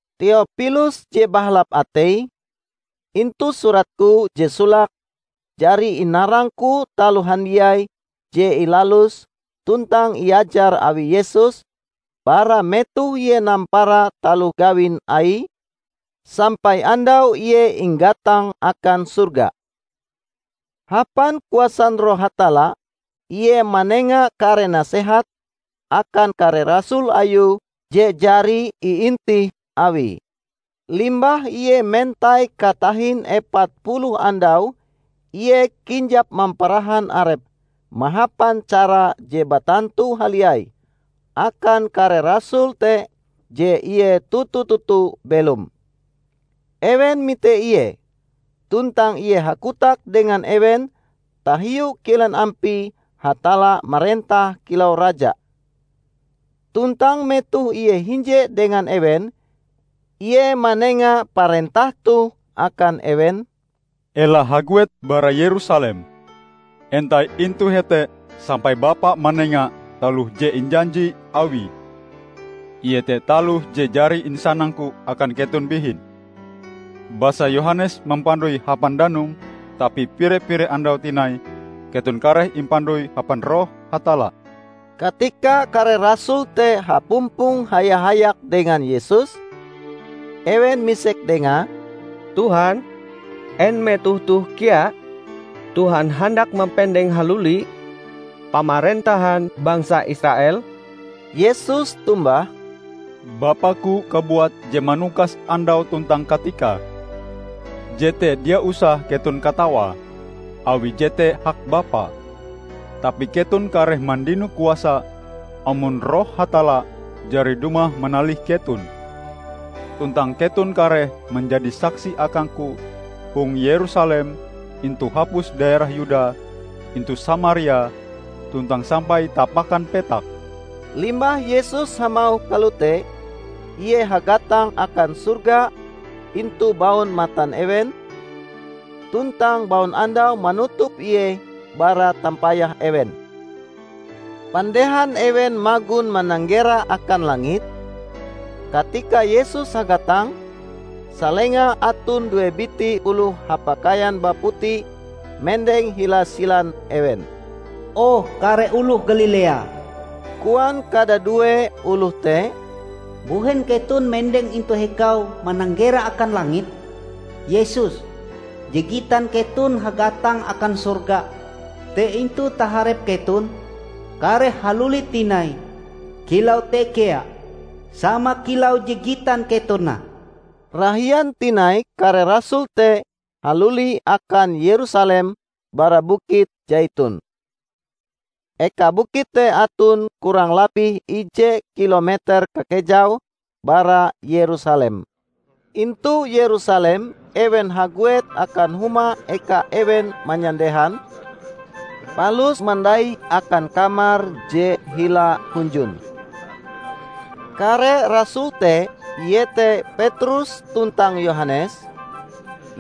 Teopilus je bahalap atei, Intu suratku je solake jari inarangku taloh handiai je ilalus tuntang iajar awi Yesus bara metoh Ie nampara taloh gawin Aie, sampai andau Ie inggatang akan sorga. Hapan kuasan Roh Hatalla Ie manenga kare nasehat akan kare rasul Ayue je jari iintih Awie. Limbah Ie mentai katahin epat puluh andau Ie kinjap mamparahan Arepe mahapan cara je batantu haliai akan kare rasul te je Ie toto-toto belom. Ewen mite Ie, tuntang Ie hakotak dengan ewen tahiu kilen ampie Hatalla marentah kilau Raja. Tuntang metoh Ie hinje dengan ewen, Ie manenga parentah toh akan ewen, "Ela haguet bara Yerusalem. Entai intu hete sampai Bapa manenga taloh je injanji Awie, iete taloh je jari insanang-Ku akan keton bihin. Basa Yohanes mampandoi hapan danum, tapi pire-pire andau tinai keton kareh impandoi hapan Roh Hatalla." Katika kare rasul te hapumpong haya-hayak dengan Yesus, ewen misek dengae, "Tuhan, en metoh toh kea Tuhan handak mampendeng haluli Pamarentahan bangsa Israel?" Yesus tombah, "Bapaku kabuat je manukas andau tuntang katikae. Jete dia usah keton katawae, awi jete hak Bapa. Tapi keton kareh mandino kuasa, amon Roh Hatalla jari dumah manalih keton. Tuntang keton kareh manjadi saksi akangku hong Yerusalem, intu hapus daerah Yuda, intu Samaria, tuntang sampai tapakan petak." Limbah Yesus hamauh kalote, Ie hagatang akan sorga intu baun matan ewen, tuntang baunandau manutup Ie bara tampayah ewen. Pandehan ewen magon mananggera akan langit, katika Yesus hagatang, salenga aton due biti oloh hapakaian baputi mendeng hila silan ewen. "O, kare oloh Galilea," koan kadadue oloh te, "mbuhen keton mendeng ih intu hikau mananggera akan langit? Yesus, je gitan keton hagatang akan sorga te intu taharep keton, kareh haluli tinai kilau te kea sama kilau je gitan keton nah." Rahian tinai kare rasul te haluli akan Yerusalem bara Bukit Saiton. Eka bukit te aton kurang labih ije kilometer kakejaue bara Yerusalem. Intu Yerusalem ewen haguet akan huma eka ewen manyandehan, palus mandai akan kamar je hila hunjun. Kare rasul te iete Petrus tuntang Yohanes,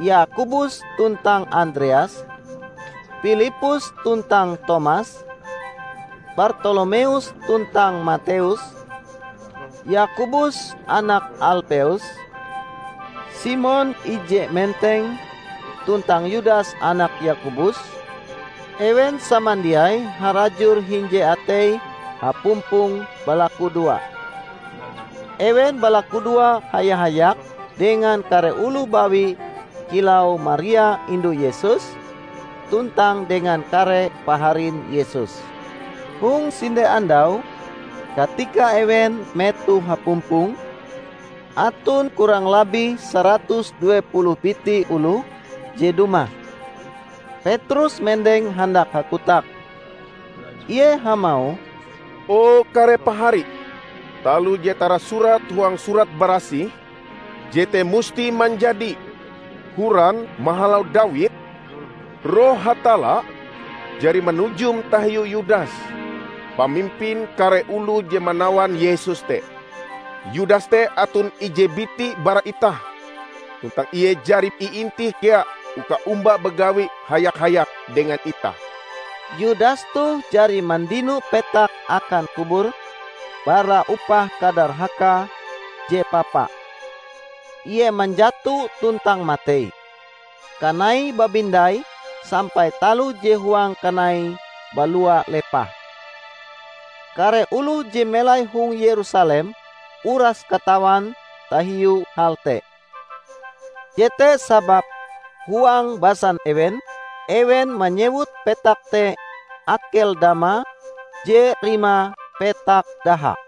Yakobus tuntang Andreas, Pilippus tuntang Tomas, Bartolomeus tuntang Mateus, Yakobus anak Alpeus, Simon Ije Menteng tuntang Yudas anak Yakobus; ewen samandiai harajur hinje ateie hapumpong balakudoa. Ewen balakudoa haya-hayak dengan kare oloh bawi kilau Maria indu Yesus, tuntang dengan kare paharin Yesus. Hong sinde andau, katika ewen metoh hapumpong -- aton kurang labih saratus due puluh biti oloh je dumah -- Petrus mendeng handak hakotak. Ie hamauh, "O kare pahari! Taloh je tarasurat huang Surat Barasih, jete musti manjadi. Horan mahalau Dawid, Roh Hatalla jari manujum tahiu Yudas, pamimpin kare oloh je manawan Yesus te. Yudas te aton ije biti bara itah, tuntang ie jari iintih kea uka omba bagawi haya-hayak dengan itah." ( Yudas toh jari mandino petak akan kubure bara upah kadarhakae je papa. Ie manjato tuntang matei, kanaie babindai sampai taloh je huang kanaie balua lepah. Kare oloh je melai hong Yerusalem uras katawan tahiu hal te. Jete sababe huang basan ewen, ewen manyewut petak te Akeldama, je rimae 'Petak Daha'.)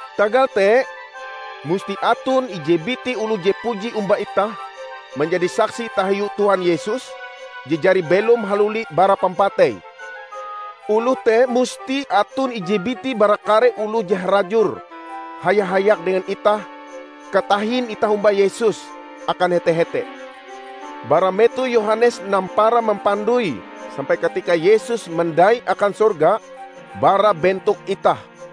Tagal te, musti aton ije biti oloh je puji omba itah manjadi saksi tahiu Tuhan Yesus je jari belom haluli bara pampatei. Oloh te musti aton ije biti bara kare oloh je harajur haya-hayak dengan itah katahin itah omba Yesus akan hete-hete, bara metoh Yohanes nampara mampandoi sampai katika Yesus mandai akan sorga bara bentok itah."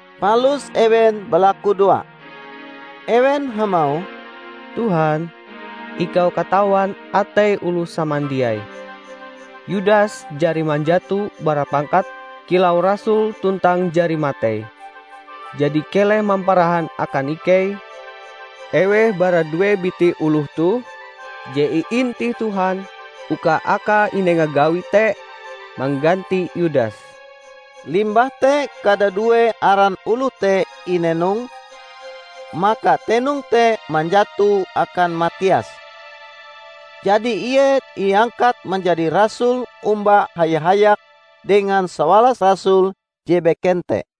Palus ewen balakudoa. Ewen hamauh, "Tuhan, ikau katawan atei oloh samandiai. Yudas jari manjato bara pangkate kilau rasul tuntang jari matei. Jadi keleh mamparahan akan ikei eweh bara due biti oloh toh je iintih Tuhan uka akae inenga gawi te mangganti Yudas." Limbah te kadadue aran oloh te inenong, maka tenong te manjato akan Matias. Jadi ie iangkat manjadi rasul omba haya-hayak dengan sawalas rasul je beken te.